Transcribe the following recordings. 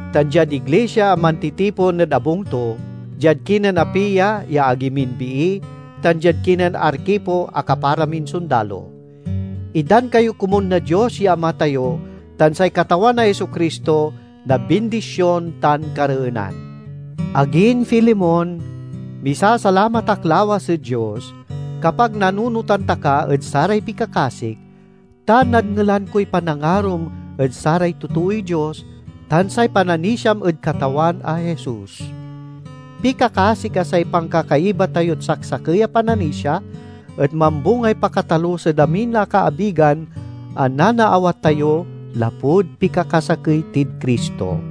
tan diad iglisia a mantitipon ed abung to, diad kinen Apia ya agi min bii, tan diad kinen Arkipo a kapara min sondalo: Itdan kayo komun na Dios ya Ama tayo tan say Katawan a Jesu-Cristo na bindision tan kareenan. Agin Filemon, misasalamat ak lawas ed Dios kapag nanunotan ta ka ed saray pikakasik, ta nadngelan koy panangarom ed saray totooy Dios, tan say pananisiam ed Katawan a Jesus. Pikakasik a say pankakaiba tayod saksakey a pananisia et mambungay pakatalus ed amin a kaabigan a nanaawat tayo, lapud pikakasakey tid Cristo.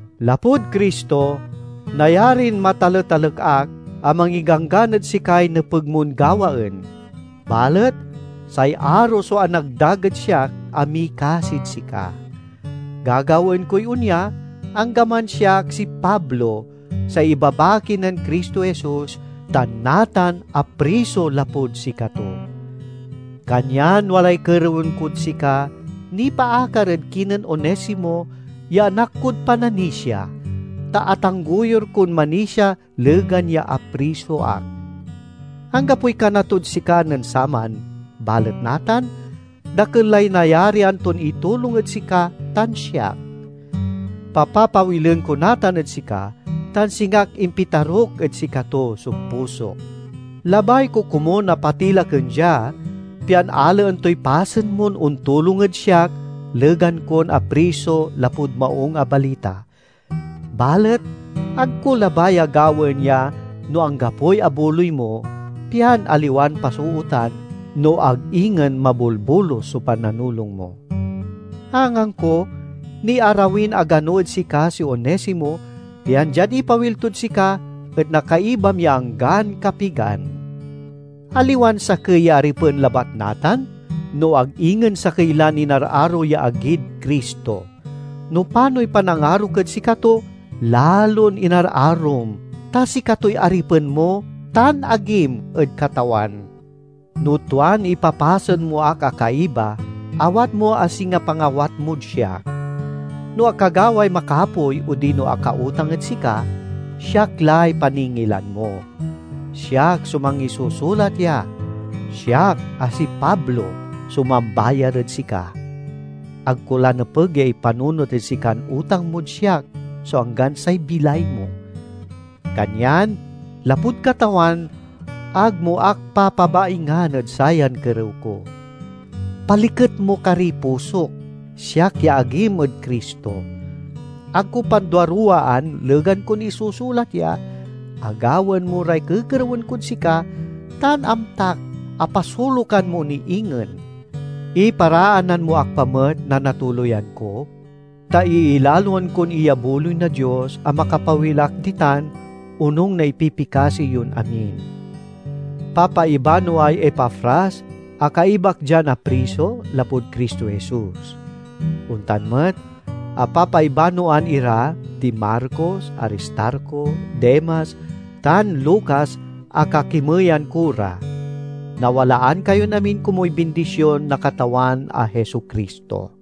Lapud Cristo, nayarin mataletalek ak a mangiganggan ed sikay nepeg mon gawaen. Balet say aro so anagdag ed siak a mikasid sika. Gagawaen koy onya, anggaman siak si Pablo, say ibabaki nen Cristo Jesus, tan natan apriso lapud sikato. Kanyan walay kerewen kod sika, nipaakar ed kinen Onesimo ya anak kod pananisia, ta atanggoyur kon manisia legan ya apriso ak. Anggapoy kana tod sika nen saman balet natan, dakel lay nayarian ton itulong ed sika tan siak. Papapawilen ko natan ed sika tan singak impitaruk ed sikato so pusok. Labay ko komun a patilaken dia, pian alaen toy pasen mon ontulong ed siak legan kon apriso lapud Maung a Balita. Balet ag ko labay a gawaen ya no anggapoy abuloy mo, pian aliwan pasootan, no ag ingen mabolbolus, so pananulong mo. Angangko, niarawin agano ed sika si Onesimo, pian diad ipawil tod sika et nakaibam ya anggan kapigan. Aliwan sakey ya aripen labat natan, no ag ingen sakey lan inararo ya agid Cristo. No panoy panangarok ed sikato, lalon inararom, ta sikatoy aripen mo tan agim ed Katawan! No tuan ipapasen mo ak a kaiba, awat mo a singa pangawat mod siak. No akagaway makapoy odino akautang ed sika, siak lay paningilan mo. Siak so mangisusulat ya: Siak, a si Pablo, so mambayar ed sika. (Ag ko la nepeg ya ipanunot ed sikan utang mod siak so anggan say bilay mo.) Kanyan, lapud Katawan, ag mo ak papabaingan ed sayan kerew ko. Paliket mo kariy pusok, siak ya agim ed Cristo! Ag ko panduaruwaan, legan kon isusulat ya, a gawaen mo ray kekerewen kod sika, tan amtak a pasolukan mo ni ingen. Iparaanan mo ak pa met na natuloyan ko, ta iilaloan kon iyabuloy na Dios a makapawil ak ditan onung na ipipikasi yon amin. Papaibanoay Epafras a kaibak dian apriso, lapud Cristo Jesus. Ontan met a papaibanoan ira di Marcos, Aristarco, Demas, tan Lucas a kakimeyan ko ra. Nawalaan kayon amin komuy bindision na Katawan a Jesu-Cristo.